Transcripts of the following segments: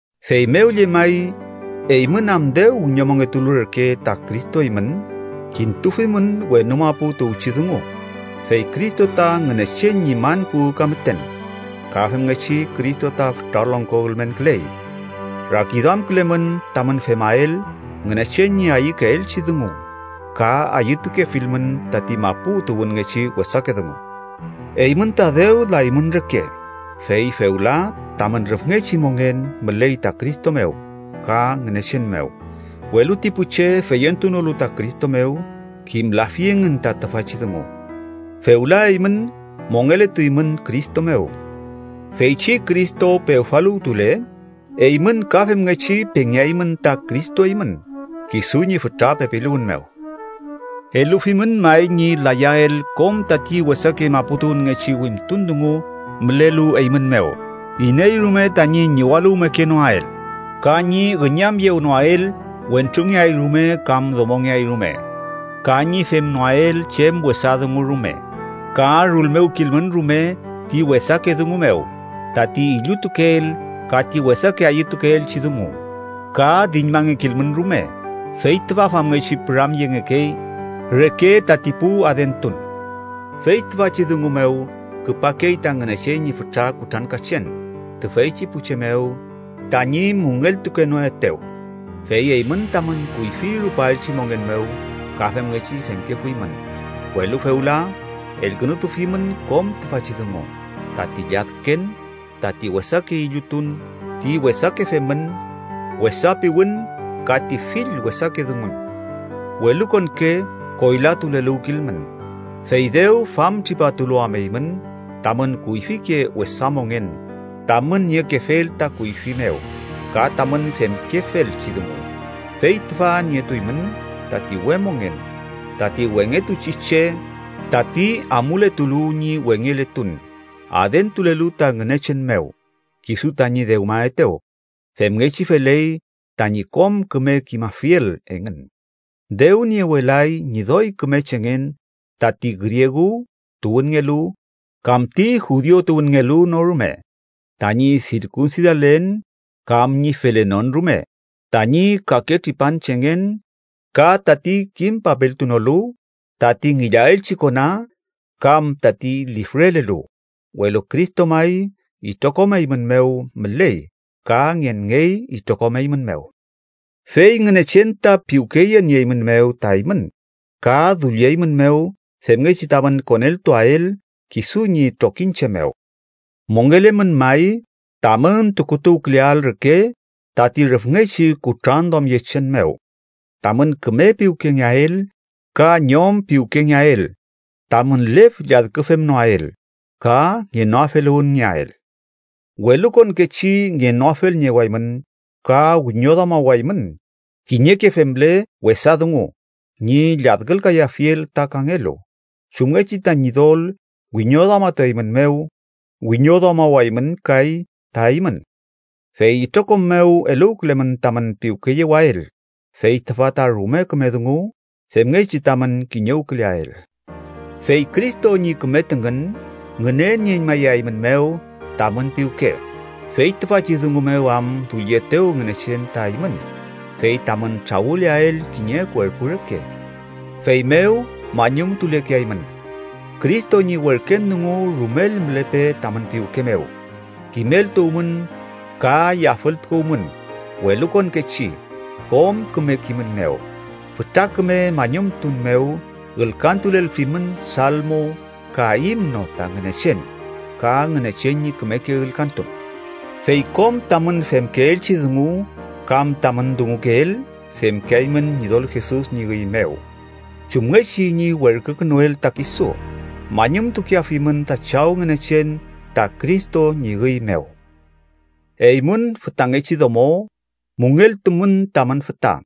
Feymew llemay, eymün am dew wiñomongetulu reke ta Cristo eymün, kintufimün wenu mapu tuwchi dungu, fey Cristo ta Ngünechen ñi man kuwü ka müten ka femngechi Cristo ta fütra longko ülmenküley. Rakiduamkülemün tamün femael Ngünechen ñi ayükeelchi dungu, ka ayütukefilmün tati mapu tuwünngechi wesake dungu. Eymün ta dew laymün reke, fey fewla tamün rüfngechi mongen müley ta Cristo mew ka Ngünechen mew, welu ti pu che feyentunolu ta Cristo mew kimlafi engün ta tüfachi dungu. Fewla eymün mongeletuymün Cristo mew. Feychi Cristo pewfaluwtule, eymün ka femngechi pengeaymün ta Cristo eymün kisu ñi fütra pepiluwün mew. Elufimün may, ñi layael kom tati wesake maputuwünngechi wimtun dungu mülelu eymün mew. Iney rume tañi ñiwaluwmekenoael ka ñi üñamyewnoael wentrungeay rume kam domongeay rume, ka ñi femnoael chem wesa dungu rume, ka rulmewkilmün rume ti wesake dungu mew tati illutukeel ka ti wesake ayütukeelchi dungu, ka diñmangekilmün rume (fey tüfa famngechi püramyengekey reke tati pu adentun). Fey tüfachi dungu mew, küpakey ta Ngünechen ñi fütra kutrankachen tüfeychi pu che mew tañi müngeltukenoetew, fey eymün tamün kuyfi rupaelchi mongen mew ka femngechi femkefuymün. Welu fewla elkünutufimün kom tüfachi dungu: tati lladken, tati wesake illutun, ti wesake femün, wesa piwün ka ti fill wesake dungun. Welukonke koylatuleluwkilmün, fey dew famtripatulu am eymün tamün kuyfike wesa mongen tamün niekefel ta kuyfi mew ka tamün femkefelchi dungu, fey tüfa nietuymün tati we mongen, tati wengetuchi che, tati amuletulu ñi wengeletun adentulelu ta Ngünechen mew, kisu tañi dewmaetew, femngechi feley tañi kom küme kimafiel engün. Dew niewelay ñi doy küme chengen tati griegu tuwünngelu kam ti judiu tuwünngelu no rume, tañi sirkunsidalen kam ñi felenon rume, tañi kake tripanchengen, ka tati kim papeltunolu, tati ngillaelchi kona, kam tati lifrelelu. Welu Cristo may itrokom eymün mew müley ka ngenngey itrokom eymün mew. Fey Ngünechen ta piwkeyenieymünmew ta eymün ka dullieymünmew femngechi tamün koneltuael kisu ñi trokiñche mew. Mongelemün may, tamün tukutuwküleael reke tati rüfngechi kutranduamyechen mew, tamün küme piwkengeael, ka ñom piwkengeael, tamün lef lladküfemnoael ka ngenoafeluwünngeael. Welukonkechi ngenoafelniewaymün, ka wiñoduamawaymün kiñeke femle wesa dungu ñi lladkülkayafiel ta kangelu. Chumngechi ta Ñidol wiñoduamatueymünmew, wiñoduamawaymün kay ta eymün. Fey itrokom mew eluwkülemün tamün piwkeyewael, fey tüfa ta rume küme dungu femngechi tamün kiñewküleael. Fey Cristo ñi küme tüngün ngünenieñmayaeymünmew tamün piwke, fey tüfachi dungu mew am dullietew Ngünechen ta eymün fey tamün trawüleael kiñe kuerpu reke. Feymew mañumtulekeaymün. Cristo ñi werken dungu rumel mülepe tamün piwke mew. Kimeltuwmün, ka yafültukuwmün welukonkechi kom küme kimün mew. Fütra küme mañumtun mew ülkantulelfimün salmo ka himno ta Ngünechen, ka Ngünechen ñi kümeke ülkantun. Fey kom tamün femkeelchi dungu kam tamün dungukeel, femkeaymün Ñidol Jesus ñi üy mew chumngechi ñi werkükünuel ta kisu. Mañumtukeafimün ta Chaw Ngünechen ta Cristo ñi üy mew. Eymün fütangechi domo, müngeltumün tamün füta,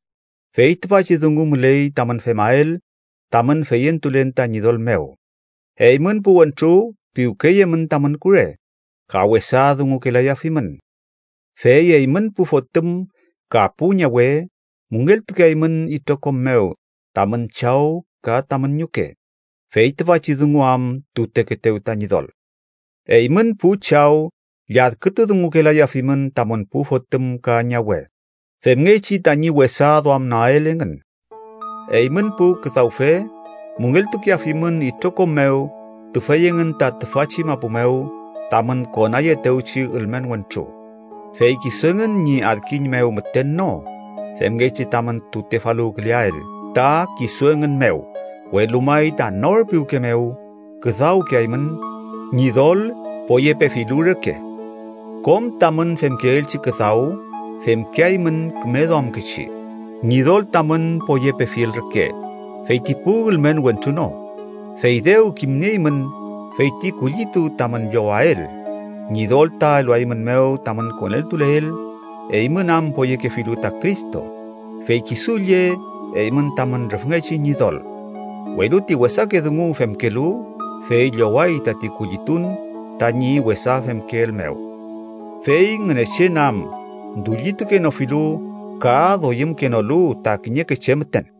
fey tüfachi dungu müley tamün femael tamün feyentulen ta Ñidol mew. Eymün pu wentru, piwkeyemün tamün kure, ka wesa dungukelayafimün. Fey eymün pu fotüm ka pu ñawe, müngeltukeaymün itrokom mew tamün chaw ka tamün ñuke, fey tüfachi dungu am tutekeetew ta Ñidol. Eymün pu chaw lladkütu dungukelayafimün tamün pu fotüm ka ñawe, femngechi tañi wesa duamnoael engün. Eymün pu küdawfe, müngeltukeafimün itrokom mew tüfey engün ta tüfachi mapu mew tamün konayeetewchi ülmen wentru, fey kisu engün ñi adkiñ mew müten no, femngechi tamün tutefaluwküleael ta kisu engün mew, welu may ta nor piwke mew küdawkeaymün, Ñidol poyepefilu reke. Kom tamün femkeelchi küdaw, femkeaymün küme duamkechi, Ñidol tamün poyepefiel reke, fey ti pu ülmen wentru no. Fey dew kimnieymün feyti kullitu tamün llowael, Ñidol ta eluaeymünmew tamün koneltuleel, eymün am poyekefilu ta Cristo, fey kisu lle eymün tamün rüfngechi Ñidol. Welu ti wesake dungu femkelu, fey lloway tati kullitun tañi wesa femkeel mew. Fey Ngünechen am dullitukenofilu ka doyümkenolu ta kiñeke che müten.